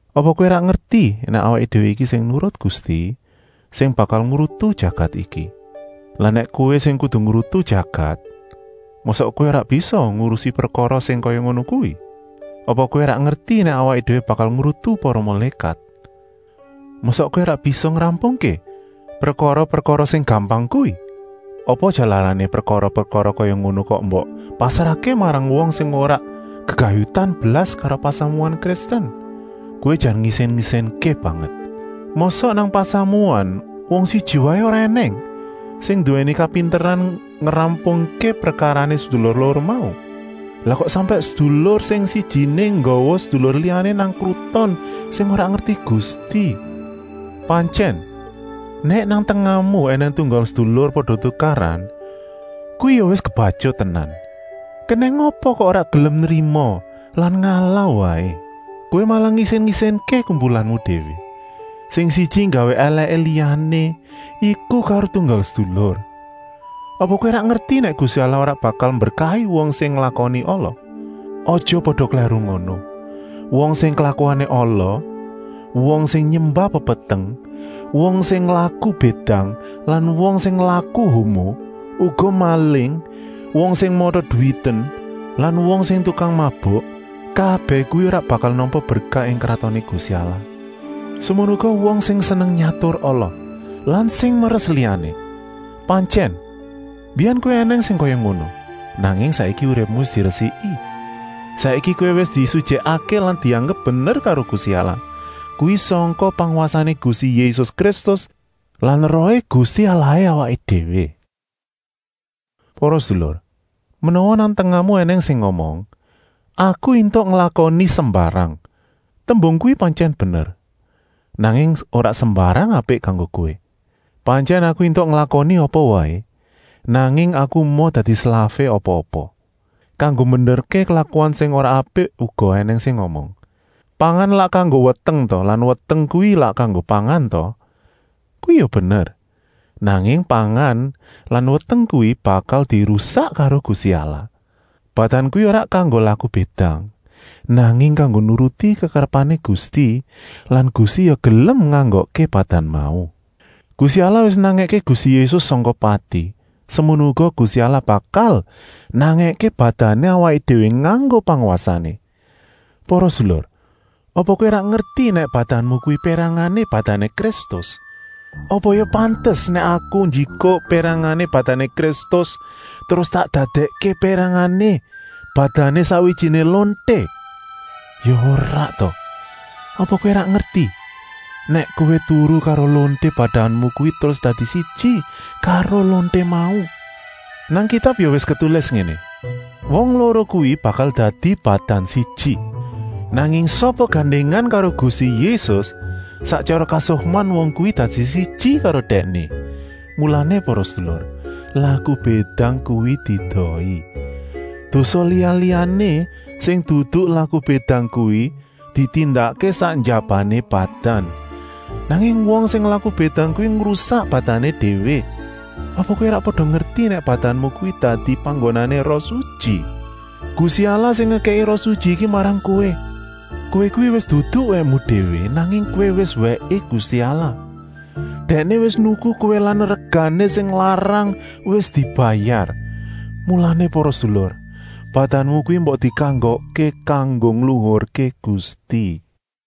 Apa kowé ora ngerti nèk awaké déwé iki sing nurut Gusti sing bakal ngrutu jagat iki? Lah nèk kowé sing kudu ngrutu jagat, mosok kowé ora bisa ngurusi prekara sing kaya ngono kuwi? Apa kowé ora ngerti nèk awaké déwé bakal ngrutu para mulékat. Mosok kowé ora bisa ngrampungké prekara-prekara sing gampang kuwi. Apa jalarané prekara-prekara kaya ngono kok mbok pasrahké marang wong sing ora gegayutan blas karo pasamuan Kristen? Kowé jan ngisin-isinké banget! Mosok nang pasamuan wong siji waé ora ènèng sing nduwèni kapinteran ngrampungké prekarané sedulur loro mau. Lah kok sampèk sedulur sing sijiné nggawa sedulur liyané nang kruton sing ora ngerti Gusti. Pantyèn, nèk nang tengahmu ènèng tunggal sedulur pada tukaran kuwi ya wis kebatyut tenan. Kenèng apa kok ora gelem nrima lan ngalah waé? Kowé malah ngisin-isinké kumpulanmu déwé, sing siji nggawé èlèké liyané, iku karo tunggal sedulur. Apa kowé ora ngerti nèk Gusti Allah ora bakal mberkahi wong sing nglakoni ala. Aja pada klèru ngono. Wong sing klakuané ala, wong sing nyembah pepeteng, wong sing laku bédang lan wong sing laku homo, uga maling, wong sing mata-duwiten lan wong sing tukang mabuk, kabèh kuwi ora bakal nampa berkah ing Kratoné Gusti Allah, semono uga wong sing seneng nyatur ala lan sing meres liyané. Pantyèn, mbiyèn kowé ènèng sing kaya ngono, nanging saiki uripmu wis diresiki. Saiki kowé wis disutyèkké lan dianggep bener karo Gusti Allah, kuwi sangka pangwasané Gusti Yésus Kristus lan Rohé Gusti Allahé awaké déwé. Para sedulur, menawa nang tengahmu ènèng sing ngomong: “Aku éntuk nglakoni sembarang.” Tembung kuwi pantyèn bener, nanging ora sembarang apik kanggo kowé. Pantyèn aku éntuk nglakoni apa waé, nanging aku emoh dadi slafé apa-apa. Kanggo mbenerké klakuan sing ora apik uga ènèng sing ngomong: “Pangan lak kanggo weteng ta lan weteng kuwi lak kanggo pangan ta?” Kuwi ya bener, nanging pangan lan weteng kuwi bakal dirusak karo Gusti Allah. Badan kuwi ora kanggo laku bédang, nanging kanggo nuruti kekarepané Gusti lan Gusti ya gelem nganggokké badan mau. Gusti Allah wis nangèké Gusti Yésus sangka pati, semono uga Gusti Allah bakal nangèké badané awaké déwé nganggo pangwasané. Para sedulur, apa kowé ora ngerti nèk badanmu kuwi pérangané badané Kristus? Apa ya pantes nèk aku njikuk pérangané badané Kristus terus tak dadèkké pérangané badané sakwijiné lonté? Ya ora ta! Apa kowé ora ngerti, nèk kowé turu karo lonté badanmu kuwi terus dadi siji karo lonté mau. Nang Kitab ya wis ketulis ngéné: “Wong loro kuwi bakal dadi badan siji.” Nanging sapa gandèngan karo Gusti Yésus, sak tyara kasukman wong kuwi dadi siji karo Dèkné. Mulané para sedulur, laku bédang kuwi diedohi! Dosa liya-liyané sing dudu laku bédang kuwi ditindakké sak njabané badan, nanging wong sing laku bédang kuwi ngrusak badané déwé. Apa kowé ora pada ngerti nèk badanmu kuwi dadi panggonané Roh Sutyi? Gusti Allah sing ngekèki Roh Sutyi iki marang kowé. Kowé kuwi wis dudu wèkmu déwé, nanging kowé wis wèké Gusti Allah. Dèkné wis nuku kowé lan regané sing larang wis dibayar. Mulané para sedulur, badanmu kuwi mbok dikanggokké kanggo ngluhurké Gusti.